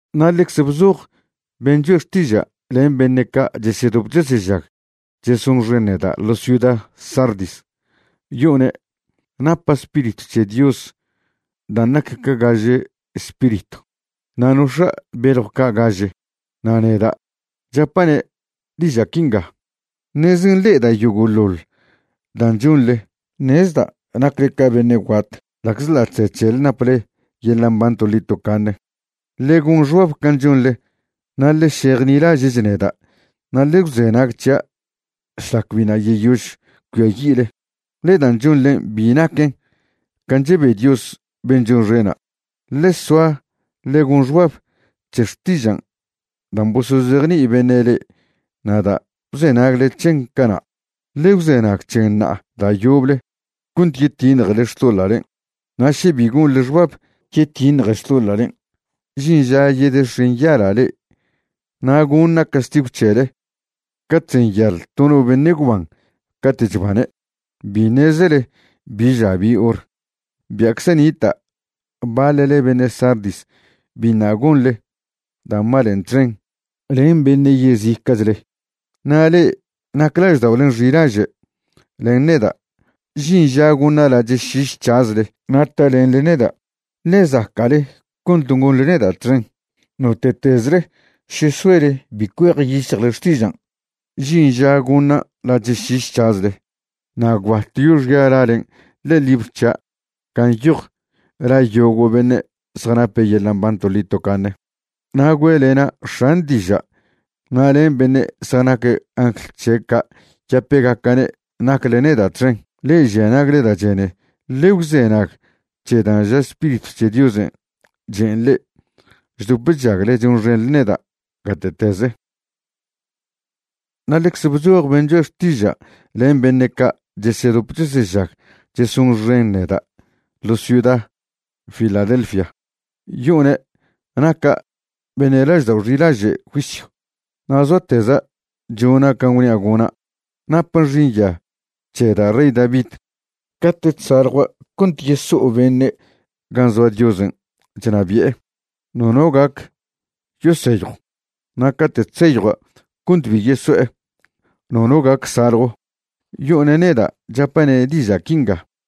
’Na' ḻecze bzoj ben' choe' xtiža' len beṉe' ca' chesedop chesežag chesonxen neda' ḻo ciuda Sardis, yo'one' napa' Spiritw c̱he Dios dan' nac ca gaže spiritw, na' nox̱a' beljw ca' gaže, na' neda' chapa'ne' diža' quinga: “Ṉeze nḻe'eda' yogo'ḻoḻ dan' chonḻe. Ṉezda' nacle ca beṉe' guat ḻa'czḻa' chze c̱hele naple yeḻa' mban toḻi tocaṉe. Ḻe gon xbab can' chonḻe na' ḻe šejnilaže'ch neda' na' ḻe gwzenag c̱hia' šlac biṉa' yeyož cuiayi'le, ḻe dan' chonḻen' bi naquen can' chebe Dios ben' chonxena'. Ḻe soa ḻe gon xbab c̱he xtižan' dan' bosozejni'i beṉe' le'e na' da' bzenagle c̱hen cana'. Ḻe gwzenag c̱hen ṉa'a da' yoble cont yetiṉjele xtoḻa'len'. Na' še bi gonḻe xbab yetiṉje xtoḻa'len', žin ža yedex̱enyala' le'e na' goṉa' castigw c̱hele ca chzenyal to no beṉe' gwban cate' chbane'. Bi ṉezele bi ža bi hor. Bia'cze nita' baḻle beṉe' Sardis biṉa' gonḻe da' malen' txen len beṉe' yezica'chle. Na' le'e nac lažda'olen' xilaže' len neda', žin ža goṉa' lache' šiš c̱hazle na' talenḻe neda', ḻe zaca'le cont gonḻe neda' txen. Note'tezle še soele bi cuejyic̱hjle xtižan', žin ža goṉa' lache' šiš c̱hazle, na' gwbat yoxia' lalen' ḻe'e libr c̱hia' gan' nyoj la yogo' beṉe' zjanape' yeḻa' mban toḻi tocaṉe, na' güe'lena' X̱an' diža' na' len beṉe' zjanac angl c̱he' ca' yapegaca'ne' nacle neda' txen. Le'e žia nagle da' chene, ḻe gwzenag c̱he dan' ža Spiritw c̱he Diosen' chen' le'e chdop chžagle chonxenḻe neda' gate'teze.” ’Na' ḻecze bzoj ben' choe' xtiža' len beṉe' ca' chesedop chesežag chesonxen neda' ḻo ciuda Filadelfia, yo'one' naca' beṉe' laždao' xilaže' juisyw, na' zoateza' chona' can' gwnia' gona'. Napa' xinya c̱he da' rey David. Cate' chsaljua' cont yeso'o beṉe' gan' zoa Diosen' chnabi'e, nono gac yoseyjw, na' cate' chseyjua' cont bi yeso'e, nono gac saljw. Yo'one' neda' chapa'ne' diža' quinga: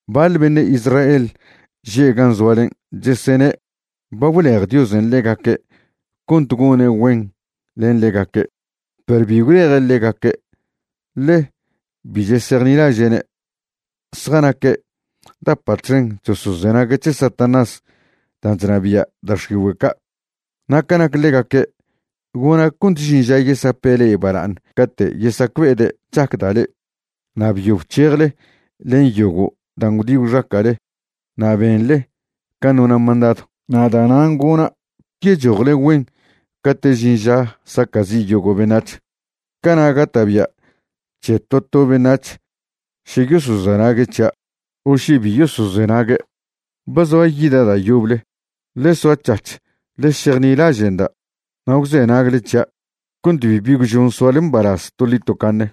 Baḻ beṉe' Israel že' gan' zoalen' chesene' ba gwlej Diosen' ḻegaque' cont gone' güen len ḻegaque', perw bi gwleje' ḻegaque', ḻe bi chesejnilaže'ne'. Zjanaque' dapa' txen chosozenague' c̱he Satanás dan' chnabia' da' x̱igüe' ca'. Na' ca nac ḻegaque', gona' cont žin ža yesape' le'e bala'aṉ cate' yesacbe'ede' chacda' le'e. Ba byo bc̱hejle len yogo' dan' gwdi gwxaca'le na' benḻe can' nona' mandadw, na' da'nan' gona' yechojle güen cate' žin ža saca'zi' yogo' beṉac̱h. Cana' gata'bia' c̱he to to beṉac̱h še yosozenague' c̱hia' o še bi yosozenague'. Ba zoa yida' da' yoble. Ḻe soac̱hac̱h ḻe šejnilaže'nda' na' gwzenagle c̱hia' cont bibi gwžon soale mbalaz toḻi tocaṉe.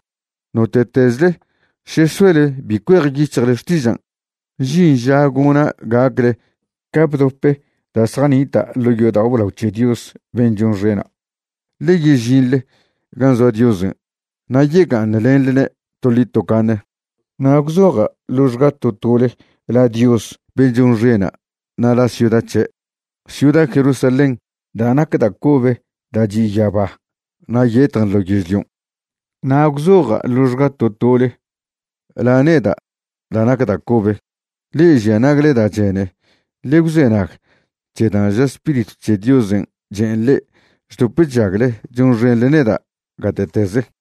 Note'tezle še soele bi cuejyic̱hle xtižan', žin ža gona' gacle ca bdope da' zjanita' ḻo' yodao' blao c̱he Dios ben' chonxena', ḻe yežinḻe gan' zoa Diosen' na' yega'aṉlenḻne' toḻi tocaṉe. Na' gwzoja' ḻoxga to tole la Dios ben' chonxena' na' la ciuda c̱he', ciuda Jerusalén da' nac da' cobe da' chi' yaba na' yetjen ḻo yežlion'. Na' gwzoja' ḻoxga to tole la neda' da' nac da' cobe. Le'e žia nagle da' chene, ḻe gwzenag c̱he dan' ža Spiritw c̱he Diosen' chen' le'e chdop chžagle chonxenḻe neda' gate'teze.”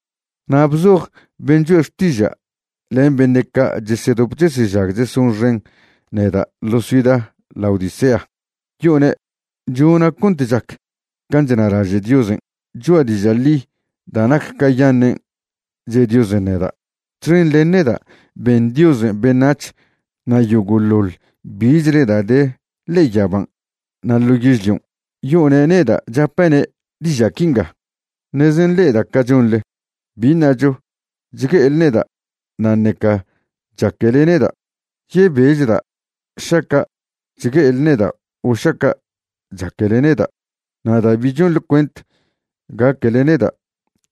’Na' bzoj ben' choe' xtiža' len beṉe' ca' chesedop chesežag chesonxen neda' ḻo ciuda Laodicea, yo'one' chona' cont chac can' chnalaže' Diosen'. Cho'a diža' ḻi da' nac cayaṉen' che' Diosen' neda'. Txen len neda' ben Diosen' beṉac̱h na' yogo'ḻoḻ bichle da' de ḻe'e yaban' na' ḻo yežlion'. Yo'one' neda' chapa'ne' diža' quinga: “Ṉeze nḻe'eda' ca chonḻe, bi ṉacho chgue'ele neda' na' ṉeca chaquele neda'. Yebechda' šaca' chgue'ele neda' o šaca' chaquele neda'. Na' da' bi chonḻe cuent gaquele neda',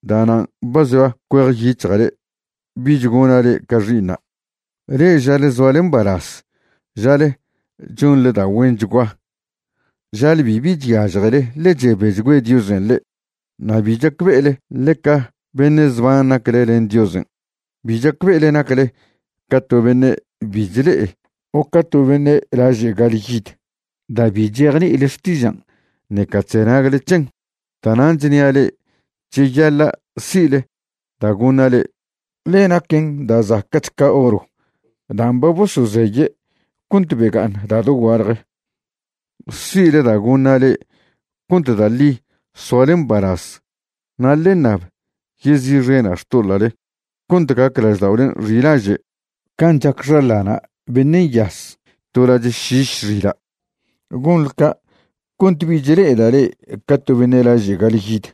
da'nan' ba zoa cuejyic̱hja' le'e bich gona' le'e ca xi'iṉa'. Le'e žale zoale mbalaz, žale chonḻe da' güenchgua, žale bibi chyažjele ḻe chebechgüe Diosen' le'e. Na' bi chacbe'ele ḻeca beṉe' zban nacle len Diosen'. Bi chacbe'ele nacle ca to beṉe' bi chle'e o ca to beṉe' laže' ga'alyid da' bi chejni'ile xtižan' ṉeca chzenagle c̱hen. Da'nan' chnia' le'e cheyaḻa' si'le da' goṉa' le'e, ḻe naquen da' zaca'ch ca oro dan' ba bosozeye' cont bega'aṉ da' dogualje. Si'le da' goṉa' le'e cont da' ḻi soale mbalaz. Na' ḻe ṉab yezi'xena' xtoḻa'le cont gac lažda'olen' xilaže' can' chac xaḻana' beṉe' nyaz to lache' šiš xila'. Gonḻe ca' cont bich le'eda' le'e ca to beṉe' laže' ga'alyid,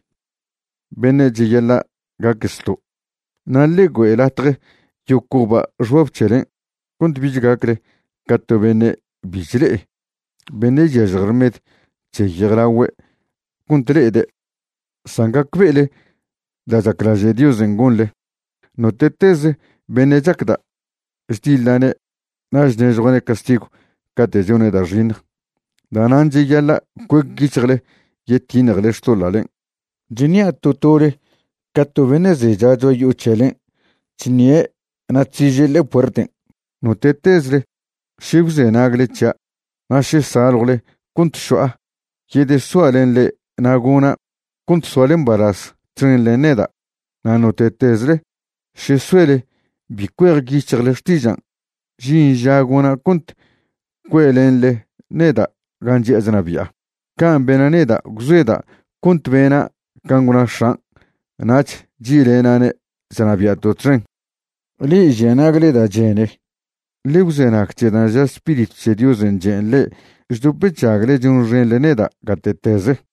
beṉe' cheyaḻa' gaque zto'. Na' ḻe güe' latje yocoba' xbab c̱helen' cont bich gacle ca to beṉe' bi chle'e, beṉe' chyažje rmed c̱he yejlagüe' cont le'ede', san gacbe'ele da' chaclaže' Diosen' gonḻe. Note'teze beṉe' chacda', chdiḻa'ne' na' chnežjua'ne' castigw cate' chone' da' xiṉj. Da'nan' cheyaḻa' cuec yic̱hjle yetiṉjele xtoḻa'len'. Chṉia' to tole ca to beṉe' zecha cho'a yo'o c̱helen' chṉie' na' chsiže' ḻe'e puerten'. Note'tezle še gwzenagle c̱hia' na' še saljwle cont šo'a, yedesoa' len le'e na' gona' cont soale mbalaz txen len neda'. Na' note'tezle še soele bi cuejyic̱hjle xtižan', žin ža gona' cont cue'lenḻe neda' gan' chi'a chnabi'a. Can' bena' neda', gwzoeda' cont bena' can' gwna X̱an' nach chi'lena'ne' chnabia'to' txen. Le'e žia nagle da' chene, ḻe gwzenag c̱he dan' ža Spiritw c̱he Diosen' chen' le'e chdop chžagle chonxenḻe neda' gate'teze.”